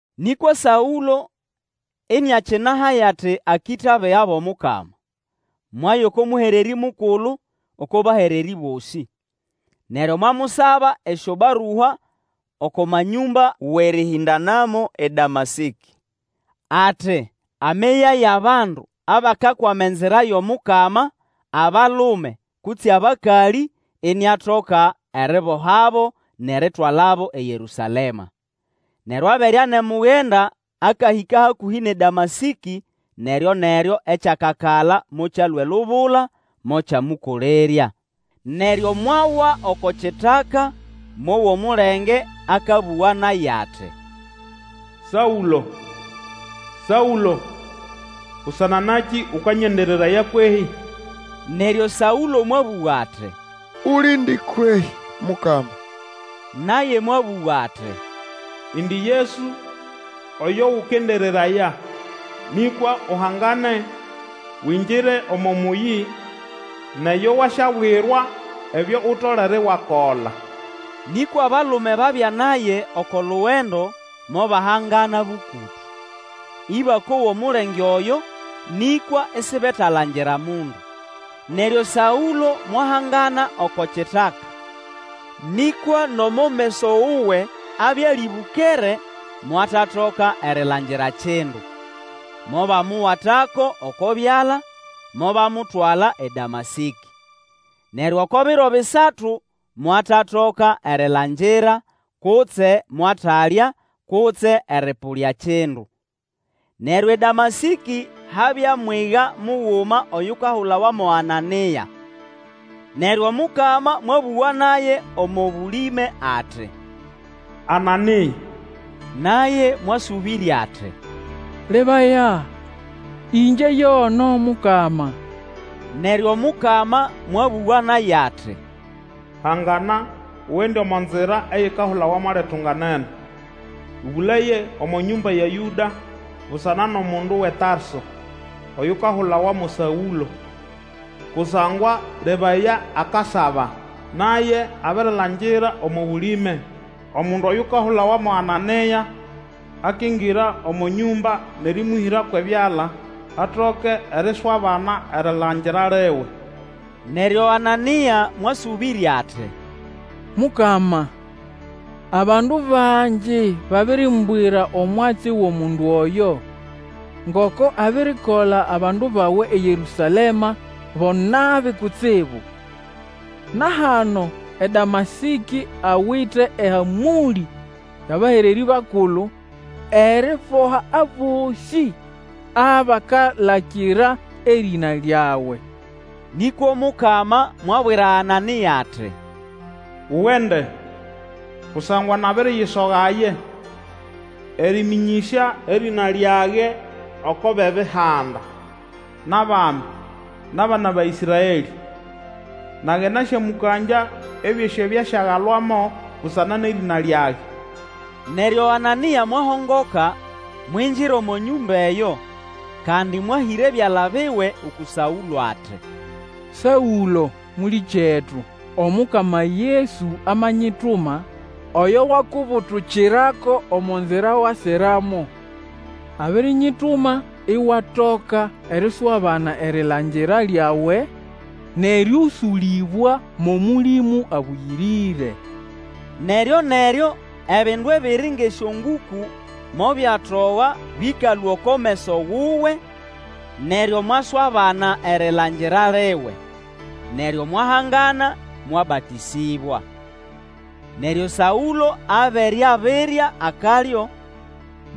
Nĩkwa Saũlo iniakinahaya ati akĩta abiga bʼomukama, mwaya oko Mũhererĩ mukulu oko bahererĩ bosĩ! Neryo mwamusaba esyobarua oko manyũmba wʼerĩhĩndanamo eDamasĩkĩ, ati ameyayo abandu abakakwama Enzira yʼomukama, abalume kutse abakalĩ, iniatoka eribohabo nʼeritwalabo eYerũsalema. Neryo abere anemugenda akahĩka hakũhĩ nʼeDamasĩkĩ, neryo-neryo ekyakakala mokyalũa elubula mokyamũkolerya. Neryo mwawa oko kitaka, mowa omulenge akabũga naye ati, Saũlo, Saũlo! busana nakĩ ũkanyendereraya kwehĩ? Neryo Saũlo mwabũga ati, Ulindi kwehĩ Mukama? Naye mwabũga ati, Indi Yesu, oyo ũkendereraya. Nĩkwa uhangane, wingire omo mũyĩ, nʼeyo wasyabwirwa ebyo utolere iwakola. Nĩkwa abalume ababya naye oko lugendo mobahangana bũkũtũ, ĩbakowa omulenge oyo, nĩkwa isibetalangira mundu. Neryo Saũlo mwahangana oko kitaka, nĩkwa nomo meso wuwe abya alĩbũkere, mwatatoka erilangira kindu, mobamuwatako oko byala, mobamutwala eDamasĩkĩ. Neryo oko biro bisatu mwatatoka erilangira, kutse mwatalya kutse erĩpũlya kindu. Neryo eDamasĩkĩ habya mwiga muguma oyukahulawa mo Anania. Neryo Omukama mwabũga naye omo bũlĩme ati, Anania! Naye mwasũbĩrya ati, Lebaya, ĩngye yono, Mukama. Neryo Omukama mwabũga naye ati, Hangana, ugende omo nzira eyikahulawa mo Litunganene, Ũbũlaye omo nyũmba ya Yũda busana nʼomundu wʼeTarso, oyukahulawa mo Saũlo, kusangwa, lebaya, akasaba. Naye abirilangira omo bũlĩme omundu oyukahulawa mo Anania akingira omo nyũmba nʼerĩmũhĩra kwʼebyala, atoke eriswabana erilangira liwe. Neryo Anania mwasũbĩrya ati, Mukama, abandu bangi babirimbwira omwatsi wʼomundu oyo, ngoko abirikola abandu bawe eYerũsalema bo nabi kutsibu. Na hano eDamasĩkĩ awite ehamũlĩ yʼabahererĩ bakulu eriboha abosĩ abakalakira erĩna lyawe. Nĩkwa Omukama mwabwira Anania ati, Ugende, kusangwa nabiriyisogaye, erĩmĩnyĩsya erĩna lyage oko bʼEbihanda, nʼabami, nʼabana ba Ĩsraelĩ. Nage nasyamũkangya ebyosĩ ebyo asyagalwamo busana nʼerĩna lyage. Neryo Anania mwahongoka, mwingira omo nyũma eyo, kandi mwahĩra ebyala biwe uku Saũlo ati, Saũlo, mũlĩkyetu, Omukama Yesu amanyituma, oyo wakubutukirako omo nzira wasiramo. Abirinyituma iwatoka eriswabana erilangira lyawe, nʼerĩũsũlĩbwa mʼOmũlĩmũ Abũyĩrĩre. Neryo-neryo ebindu ebiri ngʼesyongũkũ mobyatoga bĩkalũa oko meso wuwe, neryo mwaswabana erilangira liwe, neryo mwahangana mwabatĩsĩbwa. Neryo Saũlo abere abirya akalyo,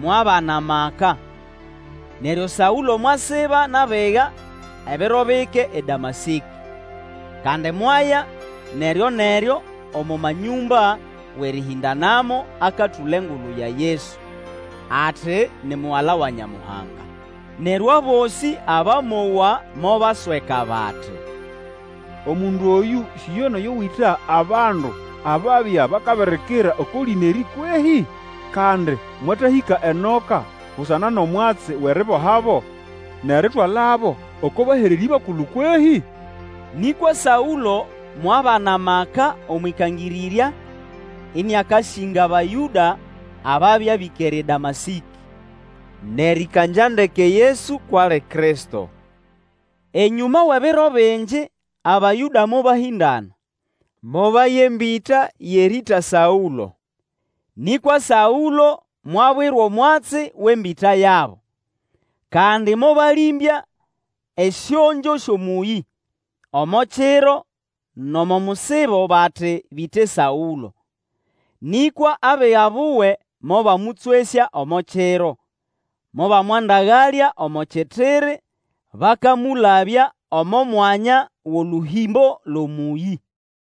mwabana maka. Saũlo akakangĩrĩraya eDamasĩkĩ Neryo Saũlo mwasiba nʼabiga ebiro bike eDamasĩkĩ. Kandi mwaya neryoneryo omo manyũmba wʼerĩhĩndanamo akatũla engulu ya Yesu, ati ni Mugala wa Nyamuhanga. Neryo abosĩ abamowa mobasweka bati, Omundu oyũ si yo nʼoyo wĩta abandu ababya bakabirikira oko lĩna erĩ kwehĩ? Kandi, mwatahĩka enoka busana nʼomwatsi wʼeribohabo nʼeritwalabo oko bahererĩ bakulu kwehĩ? Nĩkwa Saũlo mwabana amaka omwʼikangĩrĩrya ĩnĩakasĩnga Abayũda ababya bĩkere eDamasĩkĩ, nʼerĩkangya ndeke Yesu kwʼali Kristo. Enyũma wʼebiro bingi, Abayũda mobahĩndana, mobaya embĩta yʼerĩĩta Saũlo. Nĩkwa Saũlo mwabwirwa omwatsi wʼembĩta yabo. Kandi mobalĩmbya esyongyo syʼomũyĩ, omo kiro nʼomo musibo bati bĩte Saũlo. Nĩkwa abiga buwe mobamũtswesya omo kiro, mobamwandagalya omo kitiri bakamũlabya omo mwanya wʼolũhĩmbo lwʼomũyĩ.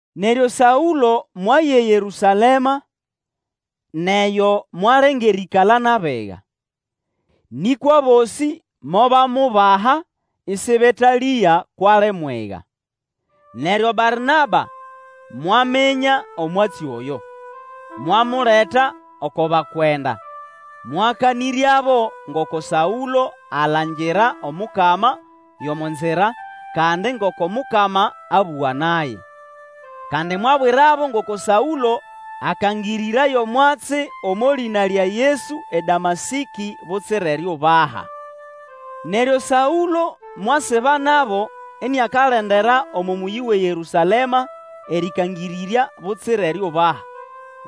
Neryo Saũlo mwaya eYerũsalema, nʼeyo mwalenga erĩĩkala nʼabiga. Nĩkwa abosĩ mobamubaha ĩsĩbetalĩga kwʼali mwiga. Neryo Barnaba mwaminya omwatsi oyo, mwamuleta oko bakwenda, mwakanĩryabo ngoko Saũlo alangira Omukama yʼomo nzira, kandi ngoko Mukama abũga naye. Kandi mwabwirabo ngoko Saũlo akangĩrĩraya omwatsi omo lĩna lya Yesu eDamasĩkĩ butsira eriubaha. Neryo Saũlo mwasiba nabo iniakalendera omo mũyĩ wʼeYerũsalema erĩkangĩrĩrya butsira eriubaha,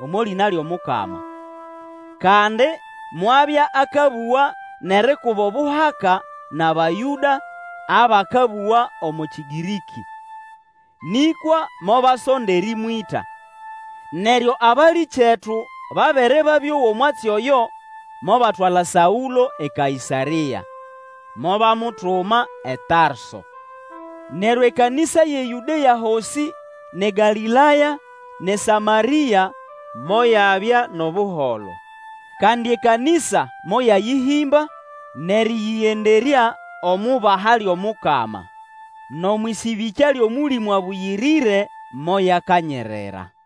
omo lĩna lyʼomukama. Kandi mwabya akabũga nʼerikuba obuhaka nʼAbayũda abakabũga omo Kĩgĩrĩkĩ. Nĩkwa mobasonda erĩmwĩta. Neryo abalĩkyetu babere babĩowa omwatsi oyo mobatwala Saũlo eKaĩsarĩa, mobamutuma eTarso. Neryo ekanĩsa yʼeYũdea hosĩ nʼeGalĩlaya, nʼeSamarĩa moyabya nʼobuholo. Kandi ekanĩsa moyayĩhĩmba, nʼerĩyĩgenderya omʼubaha lyʼomukama, nʼomwʼĩsĩbĩkya lyʼOmũlĩmũ Abũyĩrĩre, moyakanyirira.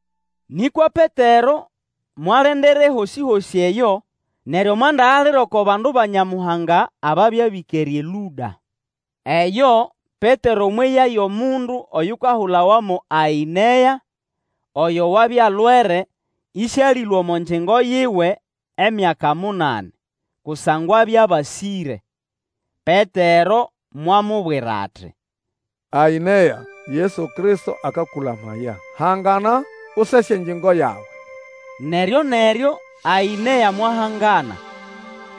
Nĩkwa Petero mwalendera ehosĩ-hosĩ eyo, neryo mwandagalira oko bandu ba Nyamuhanga ababya bĩkere eLũda. Eyo Petero mweya yʼomundu oyukahulawa mo Aĩnea, oyo wabya alwere ĩsĩalĩlũa omo ngyingo yiwe emyaka munani, kusangwa abya abasĩre. Petero mwamubwira ati, Aĩnea, Yesu Kristo akakũlamaya. Hangana, usese engyingo yawe. Neryo-neryo Aĩnea mwahangana.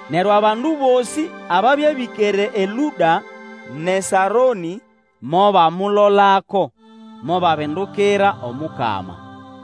Neryo abandu bosĩ ababya bĩkere eLũda nʼeSaronĩ mobamulolako, mobabindukira Omukama.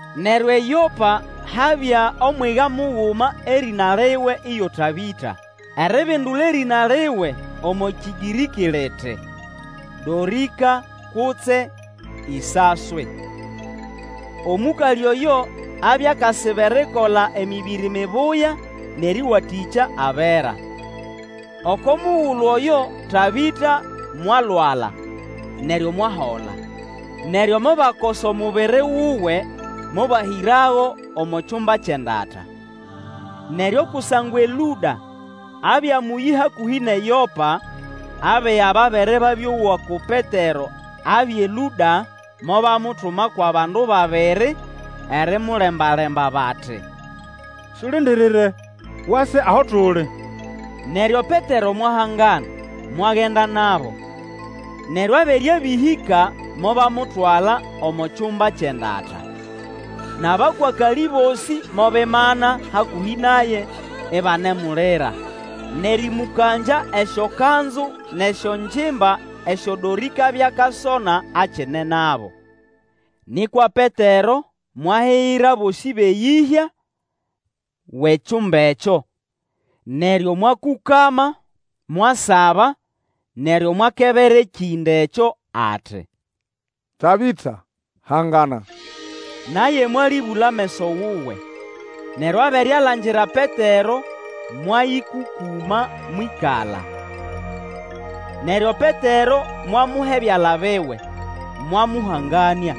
Neryo eYopa habya omwiga muguma erĩna liwe iyo Tabĩta, eribindula erĩna liwe omo Kĩgĩrĩkĩ liti, Dorĩka kutse Isaswi. Omũkalĩ oyo abya akasiba erikola emĩbĩrĩ mibuya nʼerĩwatĩkya abera. Oko mugulu oyo Tabĩta mwalwala, neryo mwahola. Neryo mobakosa omubiri wuwe mobahĩrago omo kyumba kyʼendata. Neryo kusangwa eLũda abya mũyĩ hakũhĩ nʼeYopa, abiga babere babĩowa ko Petero abya eLũda, mobamutuma kwʼabandu babiri, erimulembalemba bati, Sulindirire, wase aho tuli. Neryo Petero mwahangana, mwagenda nabo. Neryo abere abĩhĩka, mobamutwala omo kyumba ekyʼendata. Nʼabakwakalĩ bosĩ mobimana hakũhĩ naye, ibanemulira, nʼerĩmũkangya esyokanzu nʼesyongimba esyo Dorĩka abya akasona akine nabo. Nĩkwa Petero mwahigira bosĩ bʼeyĩhya wʼekyumba ekyo, neryo mwakũkama, mwasaba, neryo mwakebera ekĩnda ekyo ati, Tabĩta, hangana! Naye mwalĩbũla ameso wuwe, neryo abere alangira Petero, mwayĩkũkũma mwĩkala. Neryo Petero mwamuha ebyala biwe, mwamũhanganĩa.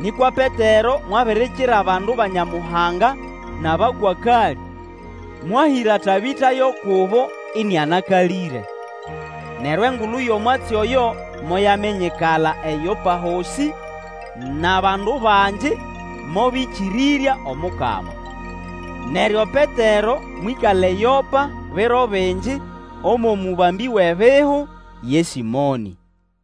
Nĩkwa Petero mwabirikira abandu ba Nyamuhanga nʼabakwakalĩ, mwahĩra Tabĩta yo kubo ĩnĩanakalĩre. Neryo engulu yʼomwatsi oyo moyaminyikala eYopa hosĩ, nʼabandu bangi mobĩkĩrĩrya Omukama. Neryo Petero mwĩkala eYopa biro bingi omwʼomũbambĩ wʼebihu, ye Sĩmonĩ.